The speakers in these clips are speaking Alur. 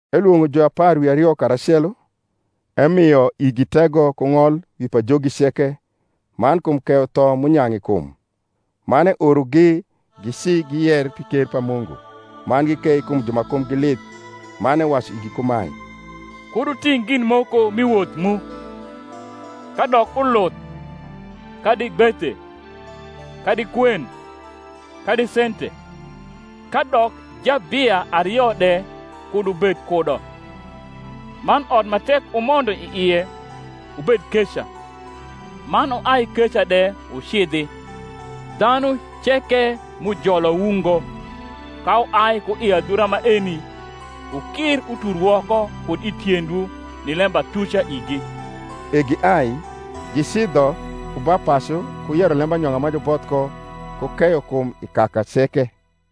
Elwong’o juapar wi ario karacelo, emio igi tego ku ng’ol wi pajogi ceke, man kum keyo tho m’unyang’ i kum, Man eorogi gici giyer pi ker pa Mungu, man gikei kum ju ma kumgi lith. Man ewacu igi kumae, Kud wuting’ gin moko mi woth mu, kadok uluth, kadi gbethe, kadi kwen, kadi sente; kadok jabia ario de kud wubed kudo. Man ot ma tek wumondo i ie, wubed keca, man wuai keca de wucidhi. Dhanu ceke m’ujolowu ngo, ka wuai ku i adhura maeni, wukir utur woko kud i tiendwu ni lembatuca igi. E giai, gicidho ku ba pacu, ku yero lembanyong’a ma juboth ko, ku keyo kum i kaka ceke.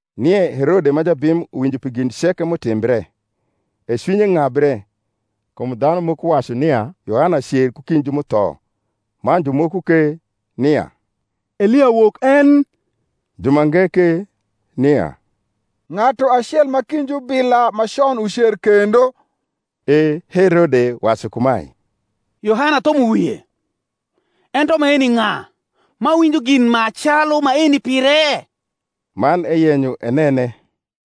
Nie Herode ma jabim uwinjo pi gin ceke m’utimbre: e cwinye ng’abre, kum dhanu moko wacu nia Yohana cer ku kind ju m’utho; man jumoko ke, nia Elia wok en; jumange ke, nia ng’atu acel ma kind jubila ma con ucer kendo. E Herode wacu kumae, Yohana athumo wie: ento maeni ng’a, m’awinjo gin ma calu maeni pire? Man eyenyo enene.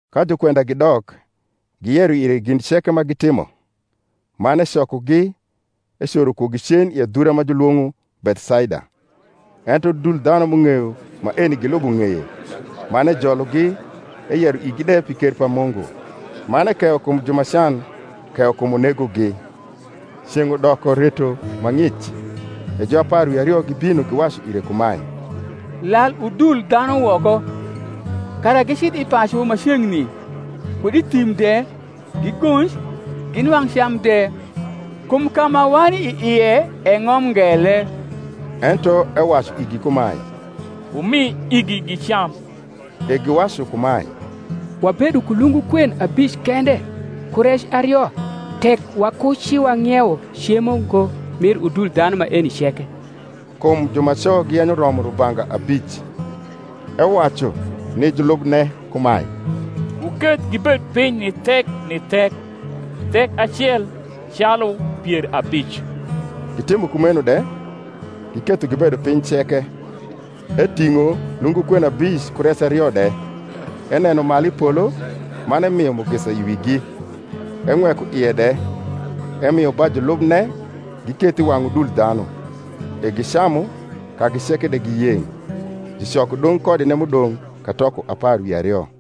Ka jukwenda gidok, giyero ire gin ceke ma gitimo. Man ecokogi, ecoro kugi cen i adhura ma julwong’o Bethsaida. Ento udul dhanu m’ung’eyo maeni gilubo ng’eye: man ejologi, eyero igi de pi ker pa Mungu, man ekeyo kum ju ma can keyo kum unegogi. Ceng’ udoko reto ma ng’ic; e juapar wi ario gibino, giwacu ire kumae, Lal udul dhanu woko, kara gicidh i pacu ma ceng’ni kud i thim de, gigonj, ginwang’ cam de: kum ka ma wani i ie e ng’om ngele. Ento ewacu igi kumae, Wumi igi gicam. E giwacu kumae, Wabedo ku lungu kwen abic kende ku rec ario tek wakuciwang’iewo cemo ngo mir udul dhanu maeni ceke. Kum jumaco giyenyo romo rubanga abic. Ewacu ni julubne kumae, Wuketh gibed piny ni thek ni thek, thek acel calu pier abic. Gitimo kumeno de, giketho gibedo piny ceke. Eting’o lungu kwen abic ku rec ario de, eneno malu i polo, man emio mugisa i wigi, eng’weko ie de: emio ba julubne giketh i wang’ udul dhanu. E gicamu, kagi ceke de giyeng’: jucoko dong’ kodine m’udong’ katoko apar wi ario.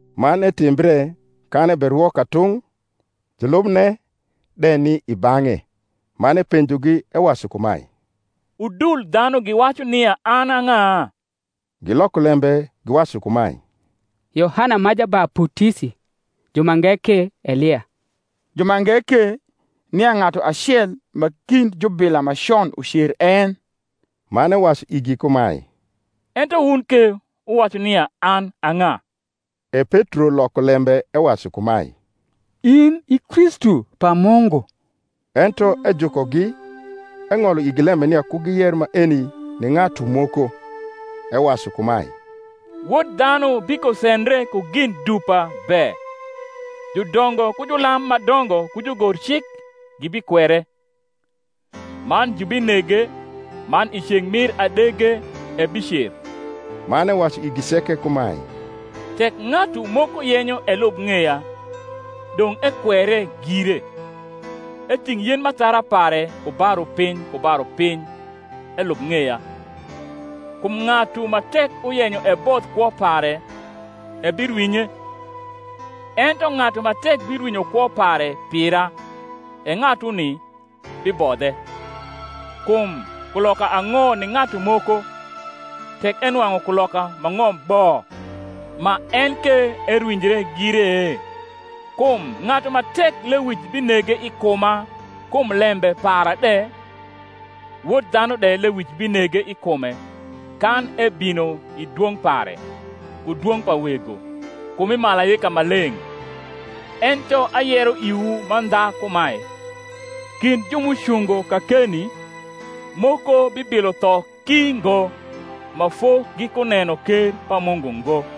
Man etimbre, kan eberwo katung’, julubne de ni i bang’e: man epenjogi, ewacu kumae, Udul dhanu giwacu nia an a ng’a? Giloko lembe giwacu kumae, Yohana ma Jabaputisi; jumange ke, Elia; jumange ke, nia ng’atu acel ma kind jubila ma con ucer en. Man ewacu igi kumae, Ento wun ke wuwacu nia an a ng’a? E Petro loko lembe ewacu kumae, In i Kristu pa Mungu. Ento ejukogi, eng’olo igi lembe nia ku giyer maeni ni ng’atu moko; ewacu kumae, Wod dhanu bikosendre ku gin dupa be, judongo ku julam ma dongo ku jugorcik gibikwere, man jubinege, man i ceng’ mir adege ebicer. Man ewacu igi ceke kumae, Tek ng’atu moko yenyo elub ng’eya, dong’ ekwere gire, eting’ yen m’athara pare ku ba rupiny ku ba rupiny, elub ng’eya. Kum ng’atu ma tek uyenyo ebodh kwo pare ebirwinye; ento ng’atu ma tek birwinyo kwo pare pira, e ng’atuni bibodhe. Kum kuloka ang’o ni ng’atu moko, tek enwang’u kuloka ma ng’om bo, ma en ke erwinjre gire? Kum ng’atu ma tek lewic binege i kuma kum lembe para de, Wod dhanu de lewic binege i kume, kan ebino i dwong’ pare, ku dwong’ pa Wego, ku mi malaika maleng’. Ento ayero iwu mandha kumae, Kind ju m’ucungo kakeni, moko bibilo tho ki ngo, ma fo gikuneno ker pa Mungu ngo.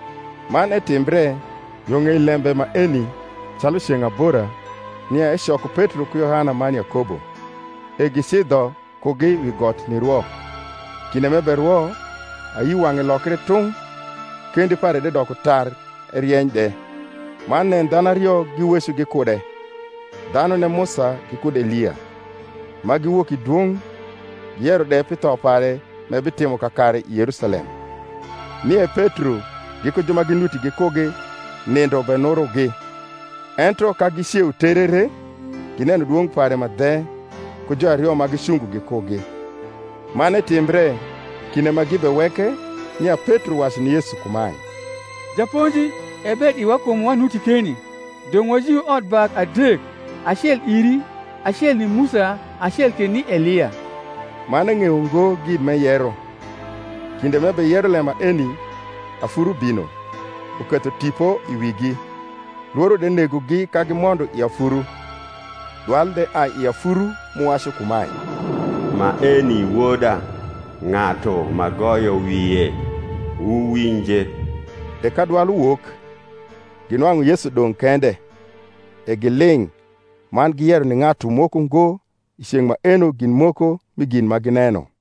Man etimbre yo ng’ei lembe maeni calu ceng’ abora, nia ecoko Petro ku Yohana man Yakobo, e gicidho kugi wi got nirwo. Kinde m’eberwo, ayi wang’e lokre tung’, kendi pare de doko tar erieny de. Man nen dhanu ario giweco gikude, dhanune Musa gikud Elia; ma giwok i dwong’, giyero de pi tho pare m’ebitimo kakare i Yerusalem. Nie Petro giku ju ma ginuti gikugi nindo benurogi: ento ka giceu terere, gineno dwong’ pare ma dhe, ku juario ma gicungo gikugi. Man etimbre, kinde ma gibeweke, nia Petro wacu ni Yesu kumae, Japonji, e ber iwa kum wanuti keni: dong’ wajiu otbak adek; acel iri, acel ni Musa, acel ke ni Elia: man eng’eyo ngo gin m’eyero. Kinde m’ebeyero lem maeni, afuru bino, uketho tipo i wigi: lworo de negogi ka gimondo i afuru. Dwal de ai i afuru m’uwacu kumae, Maeni Woda, ng’atu m’agoyo wie: wuwinje. E ka dwal uwok, ginwang’u Yesu dong’ kende. E giling’, man giyero ni ng’atu moko ngo i ceng’ maeno gin moko mi gin ma gineno.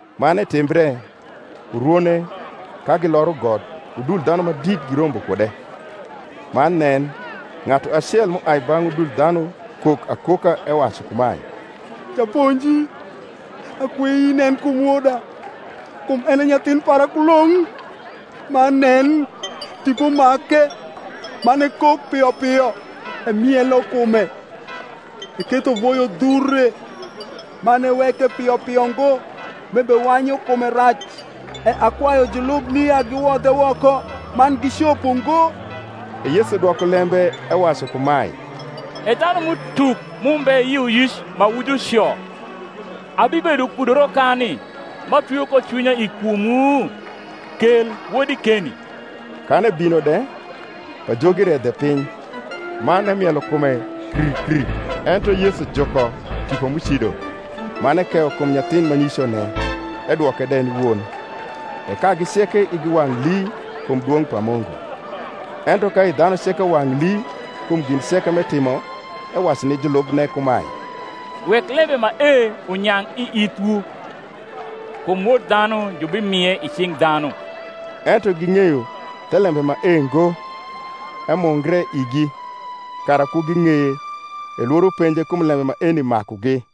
Man etimbre, urwone, ka giloro got, udul dhanu ma dit girombo kude. Man nen, ng’atu acel m’uai bang’ udul dhanu kok akoka, ewacu kumae, Japonji, akwei inen kum woda; kum en e nyathin para kulong’: man nen, tipo make, man ekok pio pio; emielo kume eketho voyo dhure, man eweke pio pio ngo, m’ebewanyu kume rac. E akwayu julubni ya giwodhe woko: man gicopo ngo. E Yesu dwoko lembe ewacu kumae, E dhanum’utuk m’umbe yioyic ma wu juco, abibedo kudu rokani, m’atwio ko cwinya i kumwu? kel wodi keni. Kan ebino de, pajogi redhe piny, man emielo kume kr kr. Ento Yesu juko tipo m’ucido, man ekeyo kum nyathin ma nicone, edwoke de ni won. E kagi ceke igi wang’ lii kum dwong’ pa Mungu. Ento ka i dhanu ceke wang’ lii kum gin ceke m’etimo, ewacu ni julubne kumae, Wek lembe mae unyang’ i ithwu: kum Wod dhanu jubimie i cing’ dhanu. Ento ging’eyo thelembe mae ngo, emungre igi, kara ku ging’eye; e lworo penje kum lembe maeni makugi.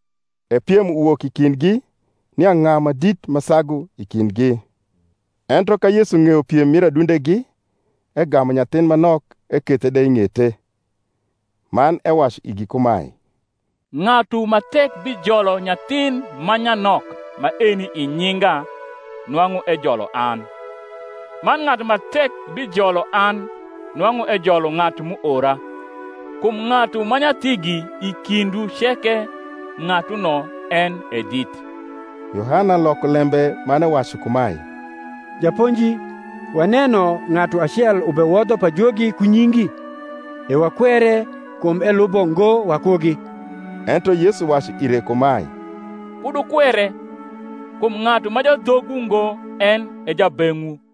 E piem uwok i kindgi, nia ng’a ma dit ma sagu i kindgi. Ento ka Yesu ng’eyo piem mir adundegi, egamu nyathin ma nok, ekethe de i ng’ete, man ewacu igi kumae, Ng’atu ma tek bijolo nyathin ma nyanok maeni i nyinga nwang’u ejolo an: man ng’atu ma tek bijolo an nwang’u ejolo ng’atu m’uora: kum ng’atu ma nyathigi i kindwu ceke, ng’atuno en e dit. Yohana loko lembe man ewacu kumae, Japonji, waneno ng’atu acel ubewodho pajogi ku nyingi; e wakwere, kum elubo ngo wakugi. Ento Yesu wacu ire kumae, Kud wukwere; kum ng’atu ma jadhogwu ngo en e jabeng’wu.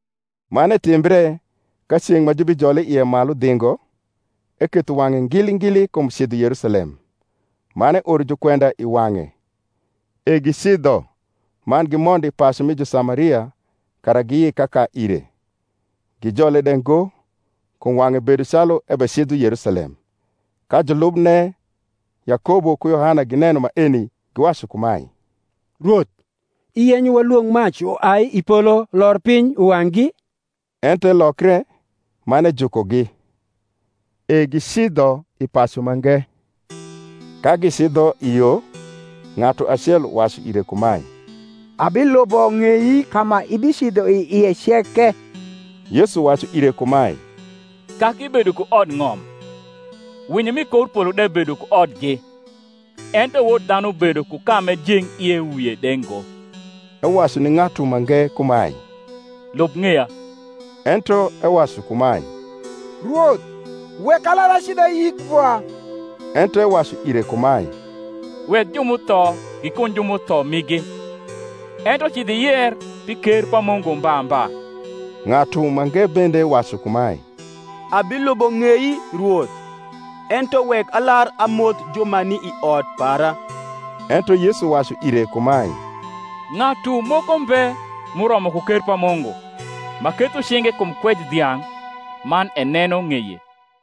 Man etimbre, ka ceng’ ma jubijole ie malu dhingo, eketho wang’e ngili ngili kum cidho Yerusalem, man eoro jukwenda i wang’e: e gicidho, man gimondo i pacu mi Jusamaria, kara giyik kaka ire. Gijole de ngo, kum wang’e bedo calu ebecidho Yerusalem. Ka julubne Yakobo ku Yohana gineno maeni, giwacu kumae, Rwoth, iyenyo walwong’ mac uai i polo lor piny, uwang’gi? Ento elokre, man ejukogi. E gicidho i pacu mange. Ka gicidho i yo, ng’atu acel uwacu ire kumae, Abilubo ng’ei ka ma ibicidho i ie ceke. Yesu wacu ire kumae, Kaki bedo ku odng’om, winyo m’i kor polo de bedo ku odgi; ento Wod dhanu bedo ku ka m’ejeng ie wie de ngo. Ewacu ni ng’atu mange kumae, Lub ng’eya. Ento ewacu kumae, Rwoth, wek alar acidh ayik vwa. Ento ewacu ire kumae, Wek ju m’utho gikuny ju m’utho migi; ento cidh iyer pi ker pa Mungu mba mba. Ng’atu mange bende wacu kumae, Abilubo ng’ei, Rwoth; ento wek alar amoth ju ma ni i ot para. Ento Yesu wacu ire kumae, Ng’atu moko mbe, m’uromo ku ker pa Mungu, ma ketho cinge kum kwej dhiang’, man eneno ng’eye.